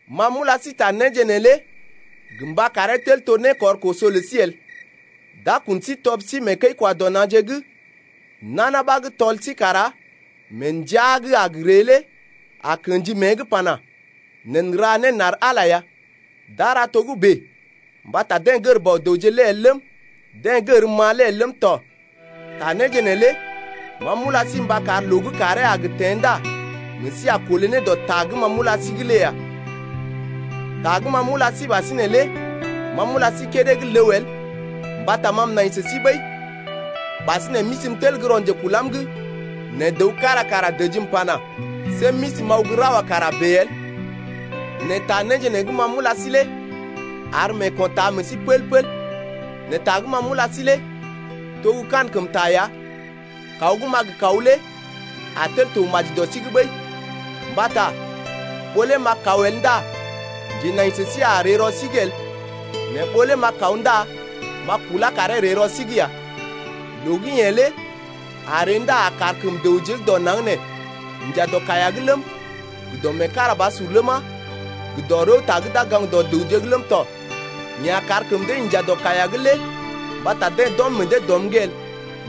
Ma m’ula sí ta néje neelé gə mba karee tel to né kɔr koso lə sí el. D’a kun sí tɔb sí mee kəi-kwa-dɔ-na̰je’g, nana ɓa gə́ tɔl sí kara mee ndəa gə́ a gə ree lé a kḛji mée’g pana: Neḛ n’ra né n’ar Ala ya. D’a ra togə́bè mbata deḛ gər Bɔ-dəwje lé el ləm, deḛ gərm-ma lé el ləm tɔ. Ta néje neelé ma m’ula sí mba kar loo gə́ kàree a gə teḛ ndá meḛ sí a kolé ne dɔ ta gə́ ma m’ula sí’g lé ya. Kula ra Ndilmeenda lé Ta gə́ ma m’ula sí ɓasinè lé ma m’ula sí kédé gə́ ləw el mbata ma m’nai sə sí ɓəi. Ɓasinè m’isi m’tel gə́ rɔ njekulam’g, nɛ dəw kára kara dəjim pana: See m’isi m’aw gə́ ra wa kara bèe el. Nɛ ta néje nee gə́ ma m’ula sí lé ar meeko̰ taa meḛ sí pəl-pəl. Nɛ ta gə́ ma m’ula sí lé to gə́ kankəmta ya, kaw gə́ m’a gə kaw lé a tel to maji dɔ sí’g ɓəi. Mbata ɓó lé m’a kaw el ndá njenai sə sí a ree rɔ sí’g el, nɛ ɓó lé m’a kaw ndá m’a kulá karee ree rɔ sí’g ya. Loo gə́ yeḛ lé a ree ndá a kar kəm dəwje gə́ dɔ naŋg nee inja dɔ kaiya’g ləm, gə dɔ meekarabasur ləma, gə dɔ rəwta gə́ d’a gaŋg dɔ dəwje’g ləm tɔ. Yeḛ a kar kəm dee inja dɔ kaiya’g lé mbata deḛ d’ɔm meḛ dee dɔm’g el.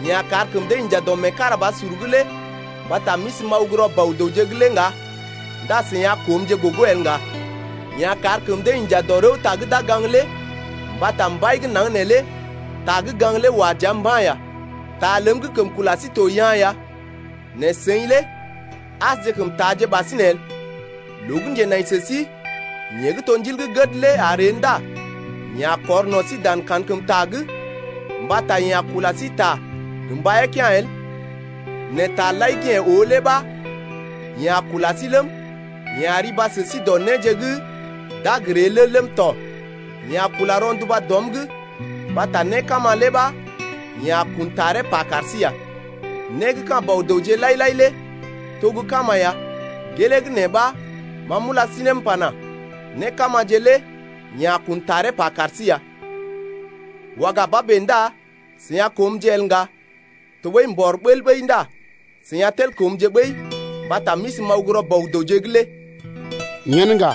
Yeḛ a kar kəm dee inja dɔ meekarabasur’g lé mbata m’isi m’aw gə́ rɔ Bɔ-dəwje’g lé ŋga ndá seḭ a koomje gogo el ŋga. Yeḛ a kar kəm dee inja dɔ rəwta gə́ d’a gaŋg lé mbata mbai gə́ naŋg neelé ta gə́ gaŋg lé wa dəa mba̰ ya. Ta ləm gə́ kəm kula sí to yaa̰ ya, nɛ seḭ lé asjekəm taaje ɓasinè el. Loo gə́ njenai sə sí, yeḛ gə́ to Ndil gə́ gəd lé a ree ndá yeḛ a kɔr no̰ sí dan kankəmta’g, mbata yeḛ a kula sí ta gə́ mbaiyee kea̰ el, nɛ taje lai gə́ yeḛ oo lé ɓa yeḛ a kula sí ləm, yeḛ a riba sə sí dɔ néje gə́ d’a gə ree lé ləm tɔ. Yeḛ a kula rɔnduba dɔm’g mbata né kama lé ɓa yeḛ a kun taree pa kar sí ya. Né gə́ ka̰ Bɔ-dəwje lai-lai lé to gə́ kama ya, gelee gə́ nee ɓa ma m’ula sí ne m’pana: Né kamaje lé yeḛ a kun taree pa kar sí ya. Waga ba bèe ndá seḭ a koomje el ŋga, tɔɓəi mbɔr bəl ɓəi ndá seḭ a tel koomje ɓəi mbata m’isi m’aw gə́ rɔ Bɔ-dəwje’g lé. Yen ŋga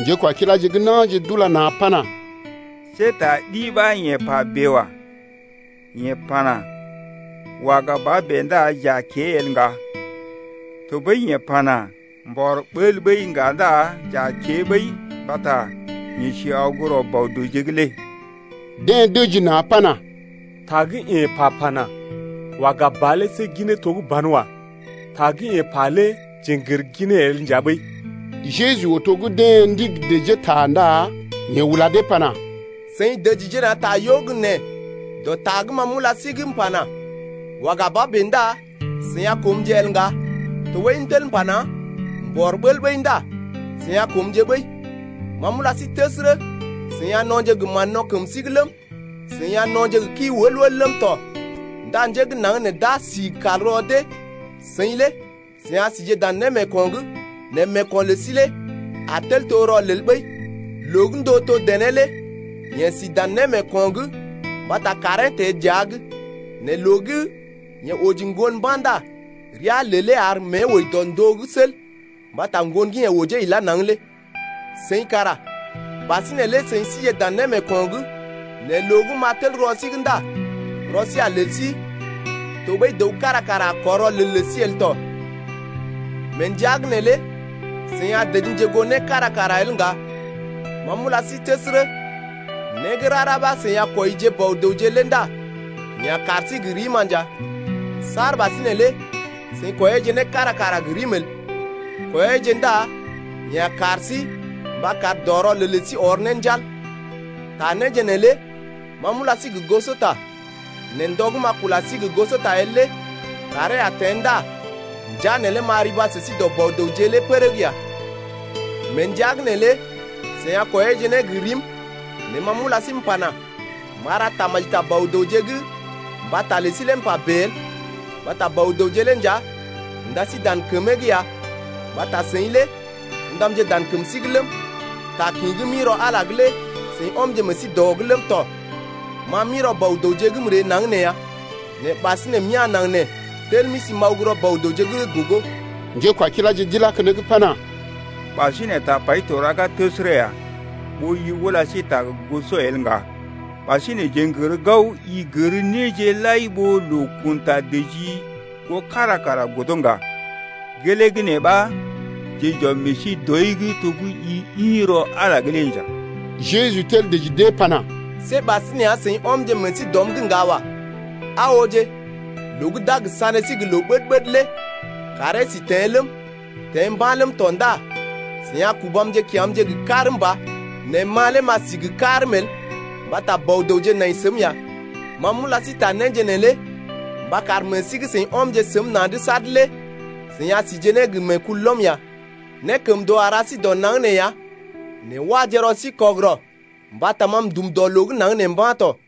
njékwakiláje gə́ na̰je d’ula na̰ pana: See ta ɗi ɓa yeḛ pa bèe wa. Yeḛ pana: Waga ba bèe ndá j’a kée el ŋga, tɔɓəi yeḛ pana: Mbɔr bəl ɓəi ŋga ndá j’a kée ɓəi mbata yeḛ si aw gə́ rɔ Bɔ-dəwje’g lé. Deḛ dəji na̰ pana: Ta gə́ yeḛ pa pana: Waga ba lé see ginee to gə́ banwa. Ta gə́ yeḛ pa lé jeḛ n’gər ginee el nja ɓəi. Jeju oo to gə́ deḛ ndigi dəjee ta ndá yeḛ ula dee pana: Seḭ dəjije na̰ ta gə́ yo gə nee dɔ ta gə́ ma m’ula sí’g m’pana: Waga ba ndá seḭ a koomje el ŋga, tɔɓəi m’tel m’pana: Mbɔr bəl ɓəi ndá seḭ a koomje ɓəi. Ma m’ula sí təsərə, seḭ a no̰je gə mán-no̰ kəm sí’g ləm, seḭ a no̰je gə kii wəl-wəl ləm tɔ ndá njé gə́ naŋg nee d’a si kal rɔ dee, seḭ lé a sije dan némeeko̰’g nɛ meeko̰ lə sí lé a tel to rɔlel ɓəi. Loo gə́ ndóo to dené lé yeḛ si dan némeeko̰’g mbata kàree teḛ dəa’g, nɛ loo gə́ yeḛ oji ŋgon mba̰ ndá rəa lelee ar mée wəi dɔ ndóo’g sel mbata ŋgon gə́ yeḛ ojee ilá naŋg lé. Seḭ kara ɓasinè lé seḭ síje dan némeeko̰’g, nɛ loo gə́ m’a tel koo sí ndá rɔ sí a lel sí tɔɓəi dəw kára kara a kɔr rɔlel lə sí el tɔ. Mee ndəa’g neelé seḭ a dəjimje goo né kára kara el ŋga. Ma m’ula sí təsərə, né gə́ rara ɓa gə́ seḭ a kwɔije Bɔ-dəwje lé ndá yeḛ a kar sí gə rim-ma nja. Saar ɓasinè lé seḭ kwɔiyeeje né kára kara gə rim el. Kwɔiyeeje ndá yeḛ a kar sí mba kar dɔ rɔlel lə sí ɔr ne njal. Ta néje neelé ma m’ula sí gə gosota. Nɛ ndɔ gə́ m’a kula sí gə́ gosota el lé kàree a teḛ ndá ndəa neelé m’a riba sə sí dɔ Bɔ-dəwje lé pərəg ya. Mee ndəa’g neelé seḭ a kwɔiyeeje né gə rim nɛ ma m’ula sí m’pana: M’a ra tamaji ta Bɔ-dəwje’g mbata lə sí lé m’pa bèe el. Mbata Bɔ-dəwje lé nja unda sí dan kəmee’g ya mbata seḭ lé ṵdamje dan kəm sí’g ləm, ta kḭ gə́ m’ḭ rɔ Ala’g lé seḭ ɔmje meḛ sí dɔ’g ləm tɔ. Ma m’ḭ rɔ Bɔ-dəwje’g m’ree naŋg nee ya, nɛ ɓasinè m’ya̰ naŋg nee m’tel m’isi m’aw gə́ rɔ Bɔ-dəwje’g lé gogo. Njékwakiláje d’ilá keneŋ pana: Ɓasinè tapai to raga təsərə ya ɓó i ula sí ta gə goso el ŋga. Ɓasinè jeḛ n’gər gao, i gər néje lai ɓó loo kun ta dəjii goo kára kara godo ŋga, gelee gə́ nee ɓa jeḛ j’ɔm meḛ sí dɔi’g to gə́ i ḭ rɔ Ala’g lé nja. Jeju tel dəji dee pana: See ɓasinè ya seḭ ɔmje meḛ sí dɔm’g ŋga wa. Aa ooje, loo gə́ d’a gə sané sí gə loo ɓəd-ɓəd lé kàree sí teḛ ləm, teḛ mba̰ ləm tɔ ndá seḭ a kubamje kya̰’mje gə karm ba, nɛ ma lé m’a sí gə karm el mbata Bɔ-dəwje nai səm ya. Ma m’ula sí ta néje neelé mba kar meḛ sí gə́ seḭ ɔmje səm na̰’d sad lé seḭ a sije ne gə meekulɔm ya. Nékəmndoo a ra sí dɔ naŋg nee ya, nɛ waje rɔ sí kɔgərɔ mbata ma m’dum dɔ loo gə́ naŋg nee mba̰ tɔ.